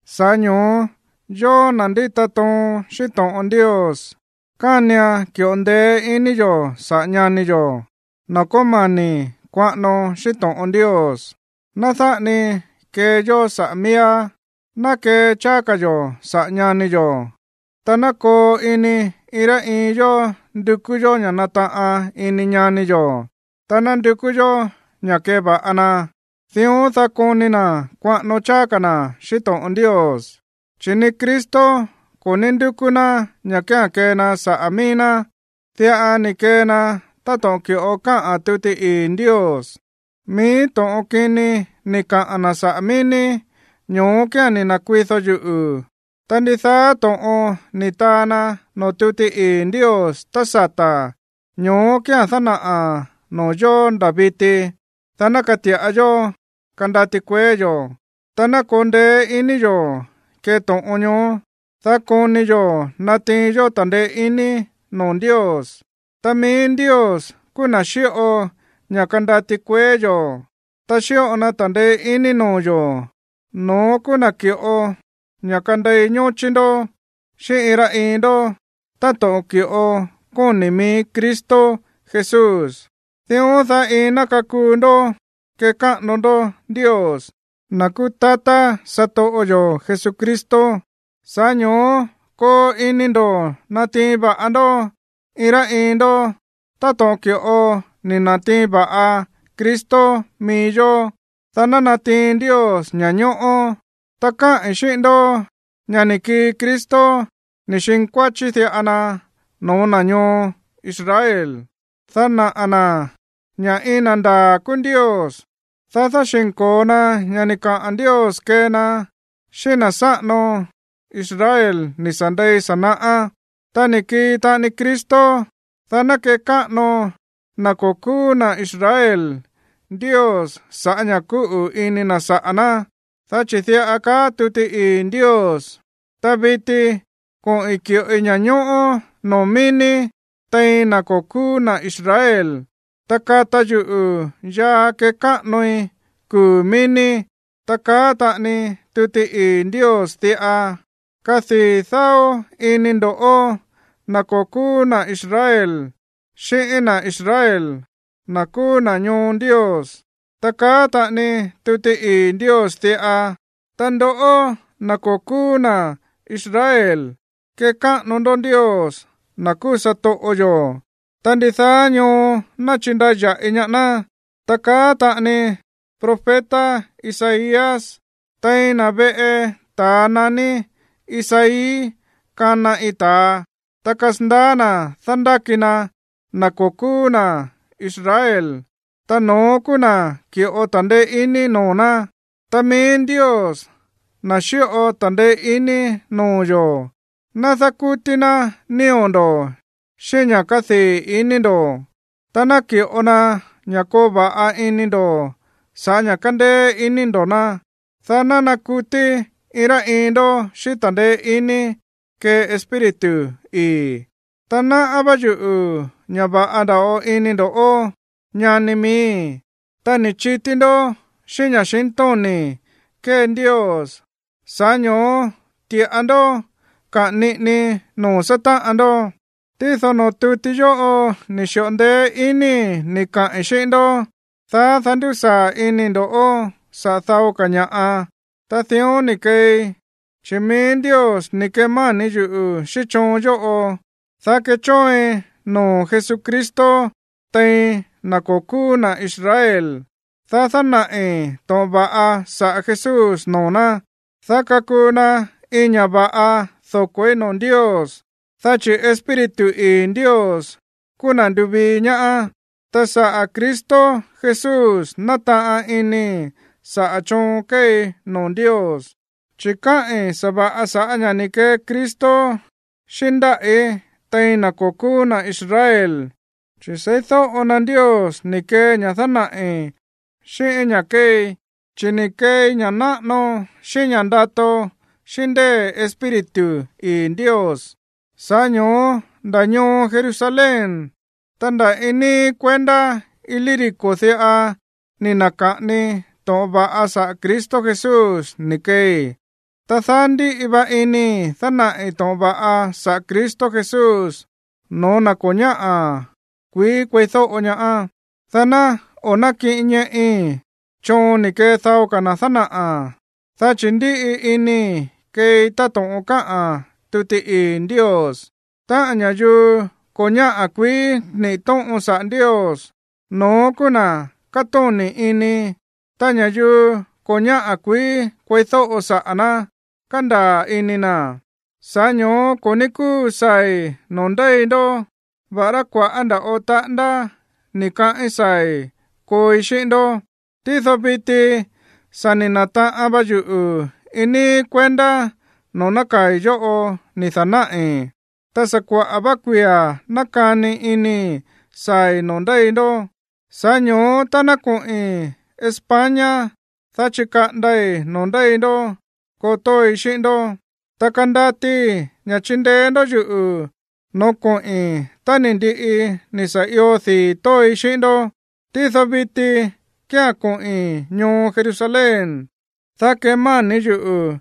Sa̱ꞌá ño̱ó, yóó, na̱ ndíta toon xíꞌín to̱ꞌon Ndios, kánian ki̱ꞌo ndeé ini yo̱ saꞌa̱ ñani yo̱, na̱ kómani̱ kuaꞌano xíꞌín to̱ꞌon Ndios. Ná dáꞌa ni kee yó saꞌa̱ miíá, ná kee cháá ka̱ yo̱ saꞌa̱ ñani yo̱. Ta ná koo ini iin rá iin yó ndukú yó ña̱ nataꞌan ini ñani yo̱, ta ná ndukú yó ña̱ keva̱ꞌa na, dión, dá koni na̱ kuaꞌano cháá ka̱ na̱ xíꞌín to̱ꞌon Ndios. Chi̱ ni Cristo ko̱ ní ndúkú ná ña̱ kía̱n kee na saꞌa̱ mií ná. Diꞌa ni̱ kee na táto̱ꞌon ki̱ꞌo káꞌa̱n tuti ii̱ Ndios: “Mií to̱ꞌon kini ni̱ kaꞌa̱n na̱ saꞌa̱ mií ní, ño̱ó kía̱n ni̱ na̱kuido yuꞌu̱.” Ta ndidaá to̱ꞌon ni̱ taa na noo̱ tuti ii̱ Ndios tá sata̱, ño̱ó kía̱n dánaꞌa̱n noo̱ yo̱ nda̱ viti, dá ná kati̱ꞌa yó kandati kueé yo̱, ta ná koo ndeé ini yo̱ kee to̱ꞌon ñoó, dá koni yo̱ natiin yó ta̱ndeé iní noo̱ Ndios. Ta mií Ndios kúú na̱ xíꞌo ña̱ kandati kueé yo̱, ta xíꞌo na ta̱ndeé iní noo̱ yo̱, no̱ón kúú na̱ ki̱ꞌo ña̱ kandei ñóchí ndó xíꞌín iin rá iin ndó táto̱ꞌon ki̱ꞌo kóni̱ mií Cristo Jesús. Dión, dá iin ná kakuu ndó kekáꞌano ndó Ndios, na̱ kúú tatá satoꞌo yo̱ Jesucristo. Sa̱ꞌá ño̱ó koo ini ndo̱ natiin va̱ꞌa ndó iin rá iin ndó táto̱ꞌon ki̱ꞌo ni̱ na̱tiin va̱ꞌa Cristo mií yó, dá ná natiin Ndios ña̱ñóꞌó. Ta káꞌi̱n xíꞌín ndó ña̱ ni̱ kii Cristo ni̱ xinkuáchí diꞌa na no̱ó na̱ ñoo Israel, dá naꞌa̱ na̱ ña̱ iin na̱ ndaa̱ kúú Ndios, dá dáxi̱nko̱o na ña̱ ni̱ kaa Ndios kee na xíꞌín na̱ sáꞌano Israel ni̱ sa̱ ndei sa̱ naꞌá. Ta ni̱ kii taꞌani Cristo, dá ná kekáꞌano na̱ ko̱ kúú na̱ Israel Ndios sa̱ꞌá ña̱ kúꞌu̱ ini na̱ saꞌa̱ ná. Dá chi̱ diꞌa kaá tuti ii̱ Ndios: Ta viti koꞌi̱n ki̱ꞌoi ña̱ñóꞌó noo̱ mií ní tein na̱ ko̱ kúú na̱ Israel, ta kata yuꞌu̱ yaa kekáꞌanoi kuu̱ mií ní. Ta kaá taꞌani tuti ii̱ Ndios diꞌa: Kadii̱ dáó ini ndo̱ꞌó, na̱ ko̱ kúú na̱ Israel, xíꞌín na̱ Israel, na̱ kúú na̱ ñoo Ndios. Ta kaá taꞌani tuti ii̱ Ndios diꞌa: Ta ndoꞌó, na̱ ko̱ kúú na̱ Israel, kekáꞌano ndó Ndios, na̱ kúú satoꞌo yo̱, ta ndidaá ñoo ná chindaya̱ꞌi ñaá ná. Ta kaá taꞌani profeta Isaías: Tein na̱ veꞌe ta̱a naní Isaí kana iin ta̱a, ta kasandaá na̱ dándáki na na̱ ko̱ kúú na̱ Israel, ta no̱ón kúú na̱ ki̱ꞌo ta̱ndeé iní noo̱ ná. Ta mií Ndios, na̱ xíꞌo ta̱ndeé iní noo̱ yo̱, ná dákútí ná nío̱ ndo̱ xíꞌín ña̱ kádii̱ ini ndo̱, ta ná ki̱ꞌo na ña̱ koo va̱ꞌa ini ndo̱ sa̱ꞌá ña̱ kándéé iní ndo̱ ná, dá ná nakutí iin rá iin ndó xíꞌín ta̱ndeé iní kee Espíritu ii̱. Ta náꞌá vá yuꞌu̱ ña̱ va̱ꞌa nda̱ꞌo ini ndo̱ꞌó, ñani miíi̱, ta ni̱ chití ndó xíꞌín ña̱xintóni̱ kée Ndios, sa̱ꞌá ño̱ó ti̱ꞌa ndó kaꞌa̱n niꞌini noo̱ sátáꞌan ndó. Tído noo̱ tuti yóꞌo ni̱ xi̱ꞌo ndeé inii̱ ni̱ kaꞌi̱n xíꞌín ndó, dá dándusaa̱ inii̱ ndo̱ꞌó saꞌa̱ dao ka̱ ña̱ꞌa, ta dión ni̱ keei, chi̱ mií Ndios ni̱ kemáni̱ yuꞌu̱ xíꞌín choon yóꞌo, dá kechóoin noo̱ Jesucristo tein na̱ ko̱ kúú na̱ Israel, dá dánaꞌi̱ to̱ꞌon va̱ꞌa saꞌa̱ Jesús noo̱ ná, dá kakuu na iin ña̱ va̱ꞌa doko̱í noo̱ Ndios, dá chi̱ Espíritu ii̱ Ndios kúú na̱ ndúvii ñaá. Ta sa̱ꞌá Cristo Jesús nátaꞌan inii̱ saꞌa̱ choon kéei noo̱ Ndios. Chi̱ káꞌi̱n sa̱va̱ꞌa sa̱ꞌá ña̱ ni̱ kee Cristo xíꞌín ndáꞌí tein na̱ ko̱ kúú na̱ Israel, chi̱ seídóꞌo na Ndios ni̱ kee ña̱ dánaꞌi̱, xíꞌín ña̱ kéei. Chi̱ ni̱ keei ña̱ náꞌano xíꞌín ña̱ ndato xíꞌín ndée̱ Espíritu ii̱ Ndios. Sa̱ꞌá ño̱ó nda̱ ñoo Jerusalén, ta nda̱ iin níí kuendá Ilírico diꞌa ni̱ na̱ka̱ꞌani to̱ꞌon va̱ꞌa saꞌa̱ Cristo Jesús ni̱ keei. Ta daá ndíꞌi va inii̱ dánaꞌi̱ to̱ꞌon va̱ꞌa saꞌa̱ Cristo Jesús no̱ó na̱ ko̱ ñáꞌa̱ kuií kueídóꞌo ñaá, dá ná o̱ nákiꞌin ñeꞌi choon ni̱ kee dao ka̱ na̱ dánaꞌa̱. Dá chi̱ ndíꞌi inii̱ keei táto̱ꞌon káꞌa̱n tuti ii̱ Ndios: Táꞌa̱n ña̱yuu ko̱ ñáꞌa̱ kuií niꞌi̱ tóꞌon saꞌa̱ Ndios, no̱ón kúú na̱ katóni̱ ini, ta ña̱yuu ko̱ ñáꞌa̱ kuií kueídóꞌo saꞌa̱ ná, kandaa̱ ini na̱. Sa̱ꞌá ño̱ó ko̱ ní kúu saa̱i̱ noo̱ ndéi ndó, va̱ꞌará kua̱ꞌá nda̱ꞌo taꞌándá ni̱ kaꞌín saa̱i̱ kooi xíꞌín ndó. Tído viti sa̱ ni̱ na̱taꞌan va yuꞌu̱ iin níí kuendá noo̱ nákaa̱i̱ yóꞌo ni̱ da̱náꞌi̱. Ta sa̱ kuaꞌa̱ vá kuia̱ nákani inii̱ saa̱i̱ noo̱ ndéi ndó. Sa̱ꞌá ño̱ó tá ná koꞌi̱n España, dá chikaꞌandai̱ noo̱ ndéi ndó koo tóoi xíꞌín ndó. Ta kandatii ña̱ chindeé ndó yuꞌu̱ no̱ó koꞌi̱n tá ni̱ ndiꞌi ni̱ sa̱ io dii̱ tóoi xíꞌín ndó. Tído viti kía̱n koꞌi̱n ñoo Jerusalén, dá kemáni̱ yuꞌu̱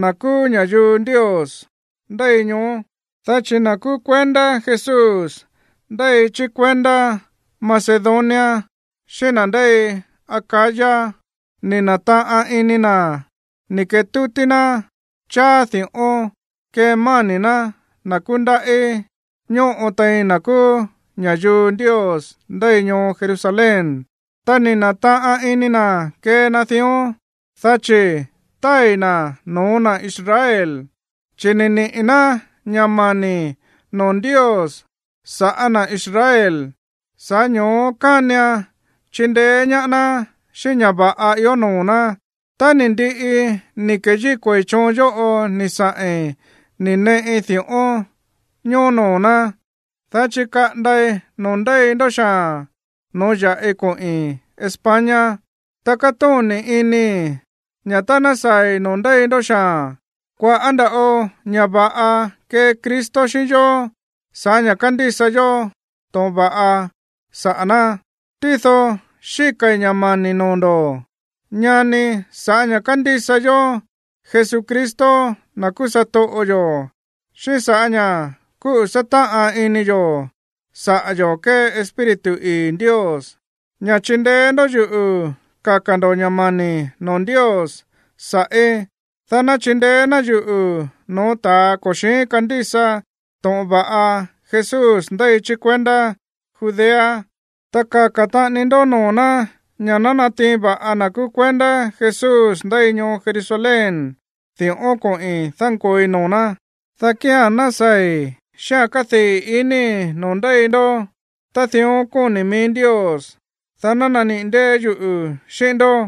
na̱ kúú ña̱yuu Ndios ndéi ñoó, dá chi̱ na̱ kúú kuendá Jesús ndéi chí kuendá Macedonia xíꞌín na̱ ndéi Acaya ni̱ na̱taꞌan ini na̱ ni̱ ketútí ná cháá di̱ꞌón kemáni̱ ná na̱ kúndaꞌí ñóꞌo tein na̱ kúú ña̱yuu Ndios ndéi ñoo Jerusalén. Ta ni̱ na̱taꞌan ini na̱ kee na dión, dá chi̱ tái̱ na̱ no̱ó na̱ Israel, chi̱ ni̱ niꞌi̱ ná ña̱ mani̱ noo̱ Ndios sa̱ꞌá na̱ Israel. Sa̱ꞌá ño̱ó kánian chindeé ñaá ná xíꞌín ña̱ va̱ꞌa ió noo̱ ná. Tá ni̱ ndiꞌi ni̱ keyíko̱i̱ choon yóꞌo ni̱ saꞌi̱n ni̱ neꞌi di̱ꞌón ñoó noo̱ ná, dá chikaꞌandai̱ noo̱ ndéi ndó xaa̱n no̱ó ya̱ꞌi koꞌi̱n España. Ta kátóni̱ inii̱ ña̱ tá ná saa̱i̱ noo̱ ndéi ndó xaa̱n, kua̱ꞌá nda̱ꞌo ña̱ va̱ꞌa kee Cristo xíꞌín yó sa̱ꞌá ña̱ kándísa yó to̱ꞌon va̱ꞌa saꞌa̱ ná. Tído xíka̱i̱ ña̱ mani̱ noo̱ ndo̱, ñani, ña̱ sa̱ꞌá ña̱ kándísa yó Jesucristo, na̱ kúú satoꞌo yo̱, xíꞌín sa̱ꞌá ña̱ kúꞌu̱ sátáꞌan ini yo̱ saꞌa̱ yo̱ kée Espíritu ii̱ Ndios, ña̱ chindeé ndó yuꞌu̱ kaka̱ ndo̱ ña̱ mani̱ noo̱ Ndios sa̱ꞌí, dá ná chindeé ná yuꞌu̱ no̱ó ta̱a ko̱ xi̱ín kandísa to̱ꞌon va̱ꞌa Jesús ndéi chí kuendá Judea. Ta kaka̱ taꞌani ndó noo̱ ná ña̱ ná natiin va̱ꞌa na̱ kúú kuendá Jesús ndéi ñoo Jerusalén di̱ꞌón koꞌi̱n dánkooi noo̱ ná. Dá kía̱n ná saa̱i̱ xíꞌa̱n kádii̱ inii̱ noo̱ ndéi ndó tá dión kóni̱ mií Ndios, dá ná naniꞌi̱ ndée̱ yuꞌu̱ xíꞌín ndó.